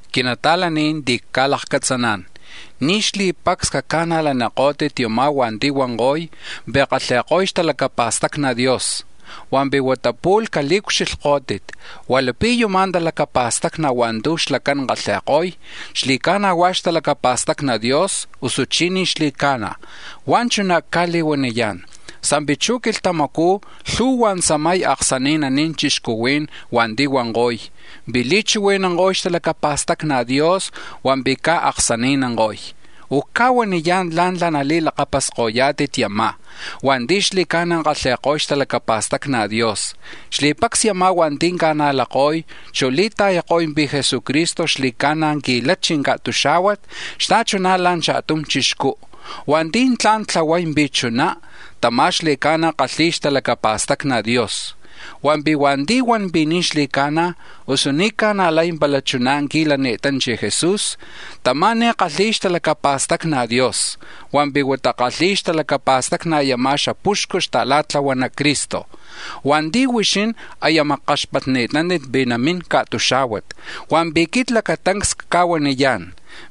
Quinata̱laní̱n ti̱ cca̱lakcatzaná̱n, ni̱ xli̱pacs caca̱najlanikó̱tit yumá̱ hua̱nti̱ huanko̱y pi̱ kalhi̱ko̱y xtalacapa̱stacni Dios, hua̱mpi̱ huata pu̱lh cali̱ucxilhkó̱tit hua̱ lapi̱ yuma̱ talacapa̱stacni̱ hua̱ntu̱ xlacán kalhi̱ko̱y xli̱ca̱na̱ hua̱ xtalacapa̱stacni Dios, usuchí̱ ni̱ xli̱ca̱na̱. Hua̱ chuná̱ cca̱li̱huaniyá̱n sa̱mpi̱ chuj quilhtamacú̱ lhu̱hua̱ tzamay aksani̱naní̱n chixcuhuí̱n hua̱nti̱ huanko̱y pi̱ li̱chihui̱nanko̱y xtalacapa̱stacni Dios hua̱mpi̱ caj aksani̱nanko̱y. Ucca̱huaniyá̱n la̱ntla̱ nali̱lakapasko̱yá̱tit yumá̱ hua̱nti̱ xli̱ca̱na̱ kalhi̱y xtalacapa̱stacni Dios: xli̱pacs yumá̱ hua̱nti̱ ca̱najlako̱y, chu̱ li̱ta̱yako̱y pi̱ Jesucristo xli̱ca̱na̱ qui̱lachi̱ ca̱tuxá̱huat xta̱chuná̱ la̱ cha̱tum chixcú, hua̱nti̱ tla̱n tlahuay pi̱ chuná, tamá̱ xli̱ca̱na̱ kalhi̱y xtalacapa̱stacni Dios. Hua̱mpi̱ hua̱nti̱ huan pi̱ ni̱ xli̱ca̱na̱, usu ni̱ ca̱najlay pala chuná̱ qui̱lani̱tanchi̱ Jesús, tamá̱ ni̱ kalhi̱y xtalacapa̱stacni Dios, hua̱mpi̱ huata kalhi̱y xtalacapa̱stacni yuma̱ xapuxcu xta̱la̱tlahuana Cristo hua̱nti̱ huixín aya makkaxpatni̱tántit pi̱ namín ca̱tuxá̱huat. Hua̱mpi̱ quit lacatancs cca̱huaniyá̱n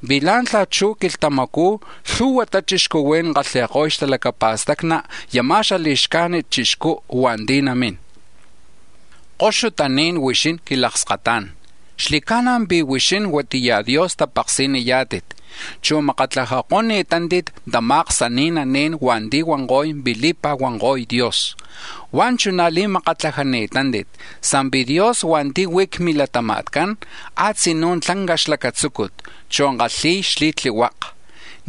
pi̱ la̱ntla̱ chuj quilhtamacú̱ lhu̱huata chixcuhuí̱n kalhi̱ko̱y xtalacapa̱stacni yuma̱ li̱xcajnit chixcú̱ hua̱nti̱ namín. Koxutaní̱n huixín quilakskata̱ncán, xli̱ca̱na̱ pi̱ huixín huatiya Dios tapaksi̱niyá̱tit, chu̱ makatlajako̱ni̱tántit tama̱ aksani̱naní̱n hua̱nti̱ huanko̱y pi̱ li̱pa̱huanko̱y Dios. Hua̱ chuná̱ li̱makatlajátit sa̱mpi̱ Dios hua̱nti̱ huí̱ c-milatama̱tcán tlak tlanca xlacatzúcut, chu̱ kalhi̱y xli̱tlihuaka,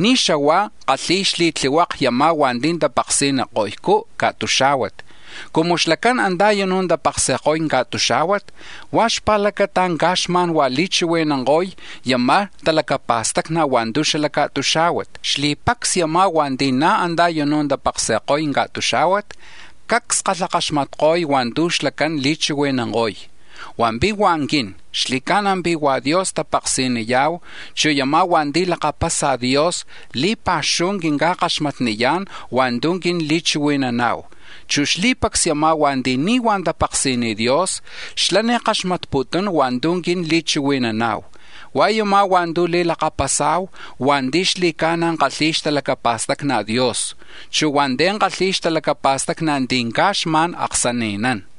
ni̱ xahua kalhi̱ko̱y xli̱tlihuaka yumá̱ hua̱nti̱ tapaksi̱niko̱ycú̱ ca̱tuxá̱huat. Cumu xlacán antá̱ u̱nú̱ tapaksi̱ko̱y ca̱tuxá̱huat, huá̱ xpa̱lacata caj xma̱n huá̱ li̱chihui̱nanko̱y yuma̱ talacapa̱stacni̱ hua̱ntu̱ xala̱ ca̱tuxá̱huat. Xli̱pacs yumá̱ hua̱nti̱ na̱ antá̱ u̱nú̱ tapaksi̱ko̱y ca̱tuxá̱huat cacs kalhakaxmatko̱y hua̱ntu̱ xlacán li̱chihui̱nanko̱y. Hua̱mpi̱ hua̱ quin, xli̱ca̱na̱ pi̱ hua̱ Dios tapaksi̱niya̱hu, chu̱ yuma̱ hua̱nti̱ lakapasa Dios li̱pa̱xuhu quinca̱kaxmatniyá̱n hua̱ntu̱ quin li̱chihui̱nana̱hu, chu̱ xli̱pacs yumá̱ hua̱nti̱ ni̱ huá̱ tapaksi̱niy Dios xlá̱ ni̱ kaxmatputún hua̱ntu̱ quin li̱chihui̱nana̱hu. Hua̱ yumá̱ hua̱ntu̱ nali̱lakapasa̱hu hua̱nti̱ xli̱ca̱na̱ kalhi̱y xtalacapa̱stacni Dios, chu̱ hua̱nti̱ kalhi̱y xtalacapa̱stacni ti̱ caj xma̱n aksani̱nán.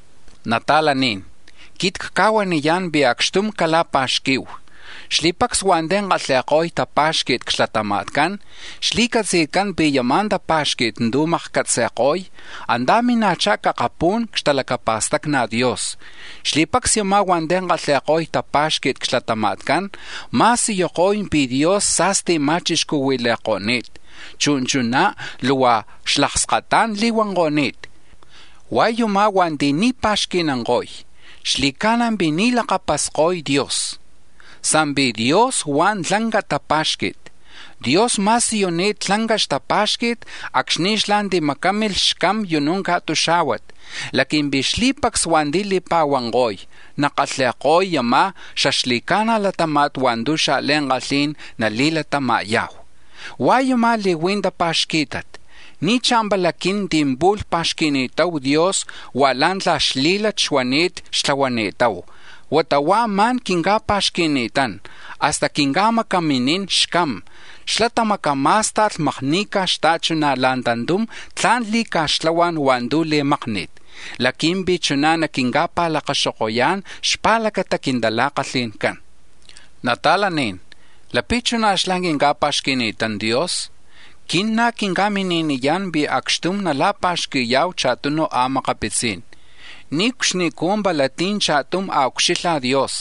Nata̱laní̱n, quit cca̱huaniyá̱n pi̱ acxtum cala̱pa̱xqui̱hu; xli̱pacs hua̱nti̱ kalhi̱ko̱y tapá̱xqui̱t c-xlatama̱tcán xli̱catzi̱tcán pi̱ yuma̱ tapá̱xqui̱t tu̱ makcatzi̱ko̱y antá̱ mina̱chá̱ c-akapú̱n c-xtalacapa̱stacni Dios. Xli̱pacs yumá̱ hua̱nti̱ kalhi̱ko̱y tapá̱xqui̱t c-xlatama̱tcán ma̱siyuko̱y pi̱ Dios sa̱sti̱ ma̱chixcuhui̱li̱ko̱ni̱t, chu̱ chuná̱ luhua xlakskatá̱n li̱huanko̱ni̱t. Hua̱ yumá̱ hua̱nti̱ ni̱ pa̱xqui̱nanko̱y, xli̱ca̱na̱ pi̱ ni̱ lakapasko̱y Dios; sa̱mpi̱ Dios huá̱ tlanca tapá̱xqui̱t. Dios ma̱siyuni̱t tlanca xtapá̱xqui̱t acxni̱ xlá̱ timacámilh xCam u̱nú̱ ca̱tuxá̱huat laqui̱mpi̱ xli̱pacs hua̱nti̱ li̱pa̱huana̱hu nakalhi̱ya̱hu yuma̱ xaxli̱ca̱na̱ latáma̱t hua̱ntu̱ xa̱li̱ankalhi̱n nali̱latama̱ya̱hu. Hua̱ yumá̱ li̱hui̱ tapa̱xquí̱tat: ni̱ chá̱mpala quin ti̱ pu̱lh pa̱xqui̱ni̱tahu Dios hua̱ la̱ntla̱ xlí̱lat xuani̱t xtlahuani̱tahu, huata huá̱ ma̱n quinca̱pa̱xqui̱ni̱tán, hasta quinca̱macaminín xCam, xlá̱ tamacamá̱sta̱lh makni̱ca̱ xta̱chuná̱ la̱ tantum tla̱n li̱ca̱xtlahuá̱n hua̱ntu̱ li̱mákni̱t laqui̱mpi̱ chuná̱ naquinca̱pa̱lacaxokoyá̱n xpa̱lacata quintala̱kalhi̱ncán. Nata̱laní̱n, lapi̱ chuná̱ xlá̱ quinca̱pa̱xqui̱ni̱tán Dios, quin na̱ quinca̱mini̱niyá̱n pi̱ acxtum nala̱pa̱xqui̱ya̱hu cha̱tunu a̱makapitzí̱n. Niucxnicú̱ pala ti̱ cha̱tum a̱ucxilha̱ Dios;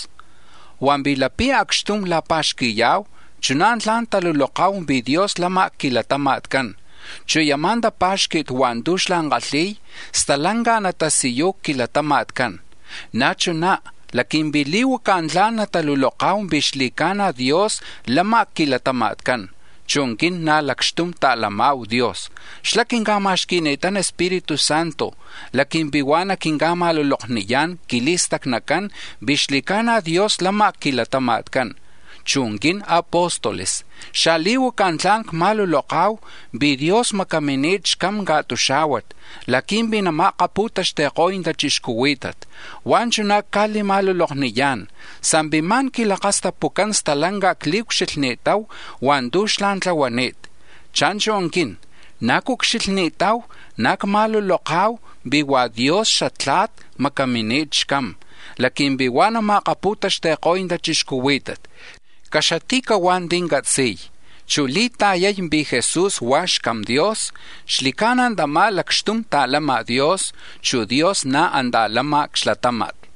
hua̱mpi̱ lapi̱ acxtum la̱pa̱xqui̱ya̱hu, chuná̱ tla̱n taluloka̱hu pi̱ Dios lama̱ c-quilatama̱tcán, chu̱ yuma̱ tapá̱xqui̱t hua̱ntu̱ xlá̱ kalhi̱y stalanca natasiyuy c-quilatama̱tcán. Na̱ chuná̱ laqui̱mpi̱ li̱huacá̱ tla̱n nataluloka̱hu pi̱ xli̱ca̱na̱ Dios lama̱ c-quilatama̱tcán, chu̱ quin na̱ lacxtum ta̱lama̱hu Dios, xlá̱ quinca̱ma̱xqui̱ni̱tán Espíritu Santo laqui̱mpi̱ huá̱ na̱ naquinca̱ma̱lulokniyá̱n c-quili̱stacnacán pi̱ xli̱ca̱na̱ Dios lama̱ c-quilatama̱tcán. Chu̱ quin apóstoles xali̱huaca tla̱n cma̱luloka̱hu pi̱ Dios macamini̱t xCam ca̱tuxá̱huat laqui̱mpi̱ nama̱akapu̱taxti̱ko̱y tachixcuhuí̱tat, huá̱ chuná̱ cca̱li̱ma̱lulokniyá̱n sa̱mpi̱ ma̱n quilakastapucán stalanca cli̱ucxilhni̱tahu hua̱ntu̱ xlá̱ tlahuani̱t. Cha̱nchu̱ quin, na̱ cucxilhni̱tahu, na̱ cma̱luloka̱hu pi̱ hua̱ Dios xaTla̱t macamini̱t xCam, laqui̱mpi̱ huá̱ nama̱akapu̱taxti̱ko̱y tachixcuhuí̱tat. Caxati̱cahuá̱ ti̱ catzi̱y, chu̱ li̱ta̱yay pi̱ Jesús hua̱ xCam Dios, xli̱ca̱na̱ tamá̱ lacxtum ta̱lama̱ Dios, chu̱ Dios na̱ antá̱ lama̱ c-xlatáma̱t.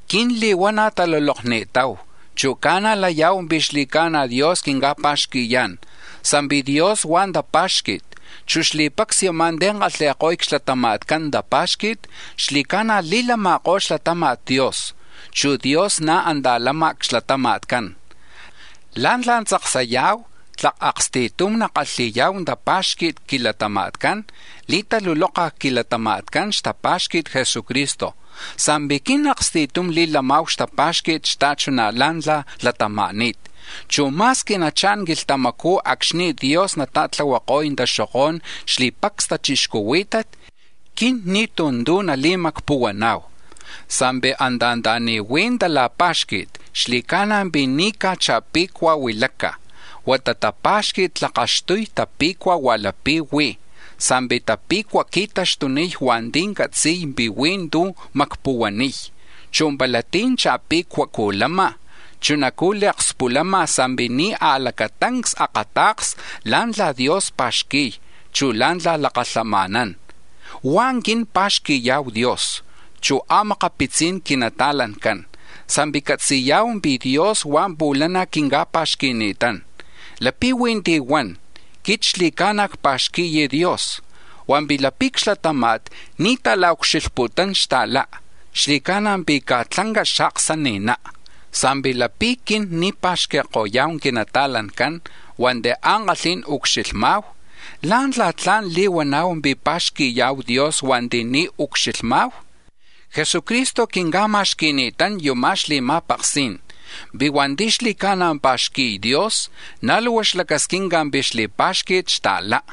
Quin li̱huana̱ talulokni̱tahu, chu̱ ca̱najlaya̱hu pi̱ xli̱ca̱na̱ Dios quinca̱pa̱xqui̱yá̱n, sa̱mpi̱ Dios huá̱ tapá̱xqui̱t, chu̱ xli̱pacs yumá̱ ti̱ kalhi̱ko̱y c-xlatama̱tcán tapá̱xqui̱t xli̱ca̱na̱ li̱lama̱kó̱ xlatama̱t Dios, chu̱ Dios na̱ antá̱ lama̱ c-xlatama̱tcán. La̱ntla̱ tzaksaya̱hu tlak aksti̱tum nakalhi̱ya̱hu tapá̱xqui̱t c-quilatama̱tcán, li̱taluloka̱ c-quilatama̱tcán xtapa̱xqui̱t Jesucristo, sa̱mpi̱ quin aksti̱tum li̱lama̱hu xtapá̱xqui̱t xta̱chuná̱ la̱ntla̱ latama̱ni̱t, chu̱ ma̱squi nachá̱n quilhtamacú̱ acxni̱ Dios nata̱tlahuako̱y taxokó̱n xli̱pacs tachixcuhuí̱tat, quin ni̱tú̱ tu̱ nali̱macpuhuana̱hu. Sa̱mpi̱ anta̱ni̱ huí̱ tala̱pá̱xqui̱t xli̱ca̱na̱ pi̱ ni̱ caj cha̱pe̱cuaj huilaca̱, huata tapá̱xqui̱t tlakaxtuy tape̱cua̱ hua̱ lapi̱ huí̱, sa̱mpi̱ tape̱cua̱ qui̱taxtuniy hua̱nti̱ catzi̱y pi̱ huí̱ tu̱ macpuhuaniy. Chu̱ pala tí̱ cha̱pe̱cuajcú̱ lama̱, chunacu̱ li̱akspulama̱ sa̱mpi̱ ni̱ a̱lacatancs akata̱ksa̱ la̱ntla̱ Dios pa̱xqui̱y, chu̱ la̱ntla̱ lakalhama̱nán. Hua̱ quin pa̱xqui̱ya̱hu Dios, chu̱ a̱makapitzi̱n quinata̱lancán sa̱mpi̱ catzi̱ya̱hu pi̱ Dios huá̱ pu̱lana̱ quinca̱pa̱xqui̱ni̱tán. Lapi̱ huí̱ ti̱ huan: “Quit xli̱ca̱na̱ cpa̱xqui̱y Dios”, hua̱mpi̱ lapi̱ c-xlatáma̱t ni̱ ta̱la̱ucxilhputún xta̱lá, xli̱ca̱na̱ pi̱ caj tlanca xaaksani̱ná. Sa̱mpi̱ lapi̱ quin ni̱ pa̱xqui̱ko̱ya̱hu quinata̱lancán hua̱nti̱ ankalhí̱n ucxilhma̱hu, ¿lá̱ntla̱ tla̱n li̱huana̱hu pi̱ pa̱xqui̱ya̱hu Dios hua̱nti̱ ni̱ ucxilhma̱hu? Jesucristo quinca̱ma̱xqui̱ni̱tán yuma̱ xli̱ma̱paksí̱n: pi̱ hua̱nti̱ xli̱ca̱na̱ pa̱xqui̱y Dios, na̱ luhua xlacasquinca̱ pi̱ xli̱pá̱xqui̱t xta̱lá.